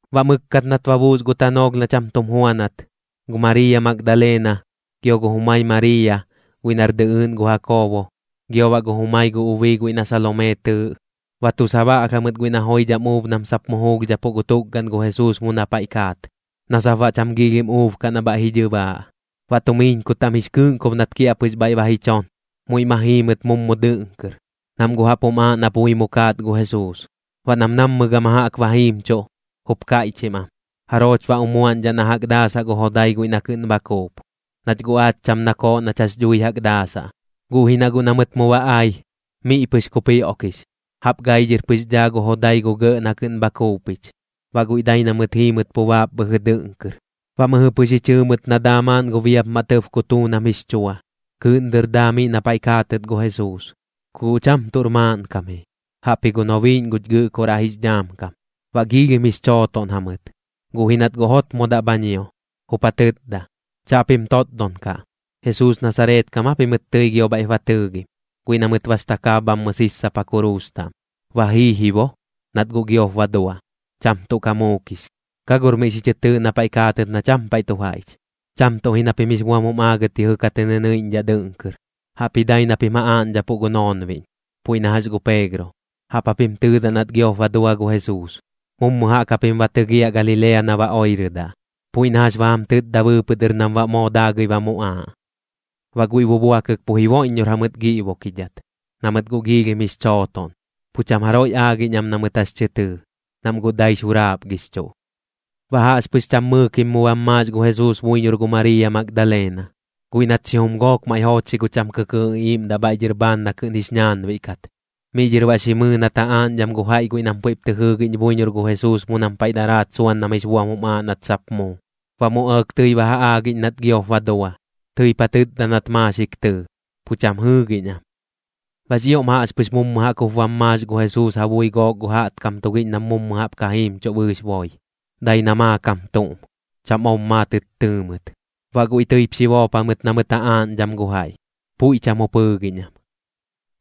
Baꞌ mɨkkat nat ba buus gu tanoolh na cham tum juanat, gu Mariiya Magdalena, gio gu jumai Mariiya guiꞌ nar dɨꞌɨɨꞌn gu Jakoobo, gio baꞌ gu jumai gu ubii guiꞌ na Salomee tɨɨꞌ, ba tu sabaꞌlh jamɨt guiꞌ na joidham uub nam sap mu juulhdhapuꞌ gu tukgaꞌn gu Jesuus mu na paiꞌ kaat, na sap baꞌ cham giilhim uub kaꞌ na bhaiꞌ ji dhɨbaaꞌ. Baꞌ tumiiñku taꞌm jix kɨꞌnkob nat kiaꞌpɨx bhaiꞌ ba ji chon, muiꞌ ma jii mɨt mummu dɨꞌn kɨr, nam guꞌ jaꞌp jum aaꞌ na pui mu kaat gu Jesuus. Baꞌ nam nammɨ gama jaꞌk ba jiimchuꞌ, jup kaiꞌchim am: ―¿Jarooch baꞌ umuaꞌñdhaꞌ na jaꞌk daasaꞌ gu jodai guiꞌ na kɨꞌn bha kuup? Nach guꞌ aach cham nakooꞌ nach jax dhui jaꞌk daasaꞌ. Guꞌ ji na guꞌ na mɨt mu ba ai, miꞌ pɨx kupioꞌkix, jaꞌp gai dhɨr pɨx dhaa gu jodai gu gɇꞌ na kɨꞌn bha kuupich. Baꞌ guiꞌ dai na mɨt jiimɨt pu baap bhɨjɨ dɨꞌn kɨr, baꞌ mɨjɨ pɨx ji chɨɨ mɨt na daa maaꞌn gu biapmaꞌ tɇb kutuun am jix chua, kɨɨꞌn dɨr daa miꞌ na paiꞌ kaatɨt gu Jesuus. Ku guꞌ cham tuꞌr maaꞌnkam ji, jaꞌpji gu nobiiꞌñ guch Gɨꞌkoraꞌ jix dhaam kam. Baꞌ giilhim jix chootoꞌn jamɨt, guꞌ ji nat guꞌ jotmodaꞌ bha ñio, jup ja tɨtda: ―Chaꞌpim totdon kaꞌ. ¿Jesuus Nasareet kam aa pimɨt tɨi gio bhaiꞌp ba tɨɨgim, guiꞌ na mɨt bas takaab bhammɨ sissapa kuruus taꞌm? Ba jii ji bo, nat guꞌ giop ba dua. Cham tuꞌ ka muukix. Ka gor miꞌ xi chɨ tɨɨꞌ na paiꞌ kaatɨt na cham paiꞌ tu jaiꞌch. Cham tuꞌ ji na pim jix buam jum aagɨt yɨjɨ ka tɨ nɨnɨiꞌñdhaꞌ dɨꞌn kɨr, jaꞌpji dai na pim ja aaꞌñdhapuꞌ gu noonbiꞌñ, puiꞌ na jax gu Peegro. Jaꞌp japim tɨɨdaꞌ nat giop ba dua gu Jesuus, mummu jaꞌk japim ba tɨgiaꞌ Galilea na ba oirɨdaꞌ, puiꞌ na jax ba jam tɨtda bɨɨpɨꞌ dɨr nam baꞌ moo daagɨi ba muꞌaaꞌ. Baꞌ guiꞌ bubuakɨk pu jiboiꞌññor jamɨt giꞌbukidhat, na mɨt guꞌ giilhim jix chootoꞌn. Pu cham jaroiꞌ aagiꞌñ am na mɨt jax tɨ tɨɨ, nam guꞌ daix juraapgixchuꞌ. Baꞌ jaꞌxpɨx cham mɨɨkim mu bam maax gu Jesuus buiñor gu Mariiya Magdalena, guiꞌ nat xijum gook maiꞌ joochxi gu cham kɨkɨɨꞌ iꞌiiꞌmdaꞌ bhaiꞌ dhɨr bhaan na kɨꞌn jix ñaanbiꞌ kat. Miꞌ dhɨr baꞌ xi mɨɨ nat ja aaꞌñdham gu jaiꞌ guiꞌ nam puiꞌp tɨ jɨɨgiꞌñ buiñor gu Jesuus mu nam paiꞌ daraat suan nam jix buam jum aaꞌ nat sap muu. Baꞌ mu ɇɇk tɨi ba ja aagiꞌñ nat giop ba dua. Tɨip ja tɨtda nat maaxik tɨɨ, pu cham jɨɨgiꞌñ am. Baꞌx ioꞌm jaꞌxpɨx mummu jaꞌk jup bam maax gu Jesuus ja bui gook gu jaꞌtkam tugiꞌñ nam mu jaꞌp ka jiimchuꞌ bɨɨx boi. Dai na maakam tuꞌm, cham ob maatɨt tɨɨ mɨt. Baꞌ guiꞌ tɨip xi boop jamɨt na mɨt ja aaꞌñdham gu jaiꞌ. Puiꞌ cham jup jɨɨgiꞌñ am.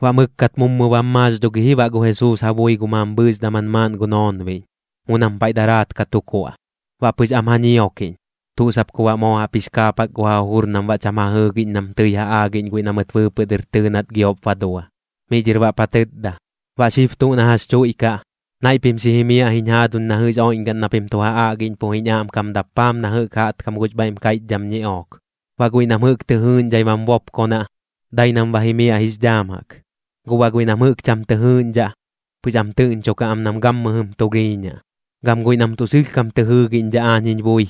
Baꞌ mɨkkat mummu bam maax dho gi ji baꞌ gu Jesuus ja bui gu mambhɨɨx daman maaꞌn gu noonbiꞌñ, mu nam paiꞌ daraat ka tu kuaꞌ. Baꞌ pɨx am ja ñiokiꞌñ, tuꞌ sap ku baꞌ moo jaꞌp jix kaapak gu ja jujur nam baꞌ cham ja jɨɨgiꞌñ nam tɨi ja aagiꞌñ guiꞌ na mɨt bɨɨpɨꞌ dɨr tɨɨ nat giop ba dua. Miꞌ dhɨr baꞌp ja tɨtda: ―Baꞌ xib dɨr tuꞌ na jax chuiꞌkaꞌ, naiꞌ pim xi jimiaꞌ jiñ jaaduñ na jɨꞌx oiꞌñgaꞌn na pim tu ja aꞌgiꞌñpuꞌ jiñ aꞌmkam dappaam na jɨꞌk jaꞌtkam gux bhaiꞌm kaiꞌchdham ñiꞌook. Baꞌ guiꞌ nam jɨꞌk tɨ jɨɨꞌñdhai bam bopkonaꞌ, dai nam ba jimiaꞌ jix dhaam jaꞌk. Guꞌ baꞌ guiꞌ nam jɨꞌk cham tɨ jɨɨgiꞌñdhaꞌ, pɨx am tɨꞌñchukaꞌ am nam gammɨjɨm tulhiiñaꞌ. Gam guiꞌ nam tuꞌ sɨlhkam tɨ jɨɨgiꞌñdhaꞌ aañ jiñ bui,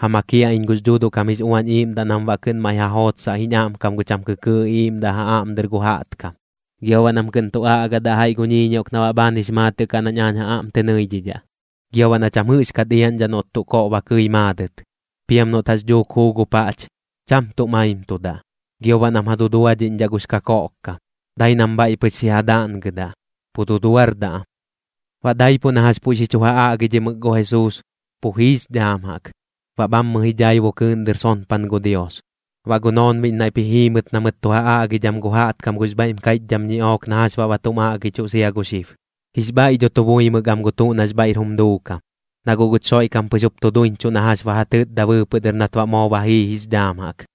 ja makiaꞌ iñ gux Dhuuduꞌ kam jix Uañ Iiꞌmdaꞌ nam baꞌ kɨꞌn maiꞌ ja jootsaꞌ jiñ aꞌmkam gu cham kɨkɨɨꞌ iꞌiiꞌmdaꞌ ja aꞌm dɨr gu jaꞌtkam, gio baꞌ nam kɨꞌn tu aꞌgadaꞌ jaiꞌ gu ñiꞌook na baꞌ bhaan jix maatɨꞌ kaꞌ nañ aañ ja aꞌm tɨ nɨidhidhaꞌ. Gio baꞌ na cham jɨꞌxkat iaꞌñdhaꞌ noꞌt tuꞌ koꞌ ba kɨi maadɨt. Piam noꞌt jax dhuuk juu gu paꞌch, cham tuꞌ maimtudaꞌ. Gio baꞌ nam ja duduadhiꞌñdhaꞌ gux kakoꞌkkam, dai nam bhaiꞌ pɨx xi ja daꞌngɨdaꞌ, pu duduardaꞌ am. Baꞌ daipuꞌ na jax puiꞌ jɨꞌ xi chu ja aꞌgidhimɨk gu Jesuus, pu jiix dhaam jaꞌk, baꞌ bhammɨ ji dhaibu kɨɨꞌn dɨr sonpan gu Dios. Baꞌ gu noonbiꞌñ naiꞌp ji jii mɨt na mɨt tu ja aꞌgidham gu jaꞌtkam gux bhaiꞌm kaiꞌchdham ñiꞌook na jax baꞌ ba tum aꞌgichuꞌ sia gu xib. Jix bhaiꞌ dho tu buimɨk am gu tuꞌ nax bhaiꞌr jum duukam, na guꞌ guch Xoiꞌkam pɨx jup tu duiñchuꞌ na jax ba ja tɨtda bɨɨpɨꞌ dɨr nat baꞌ moo ba jii jix dhaam jaꞌk.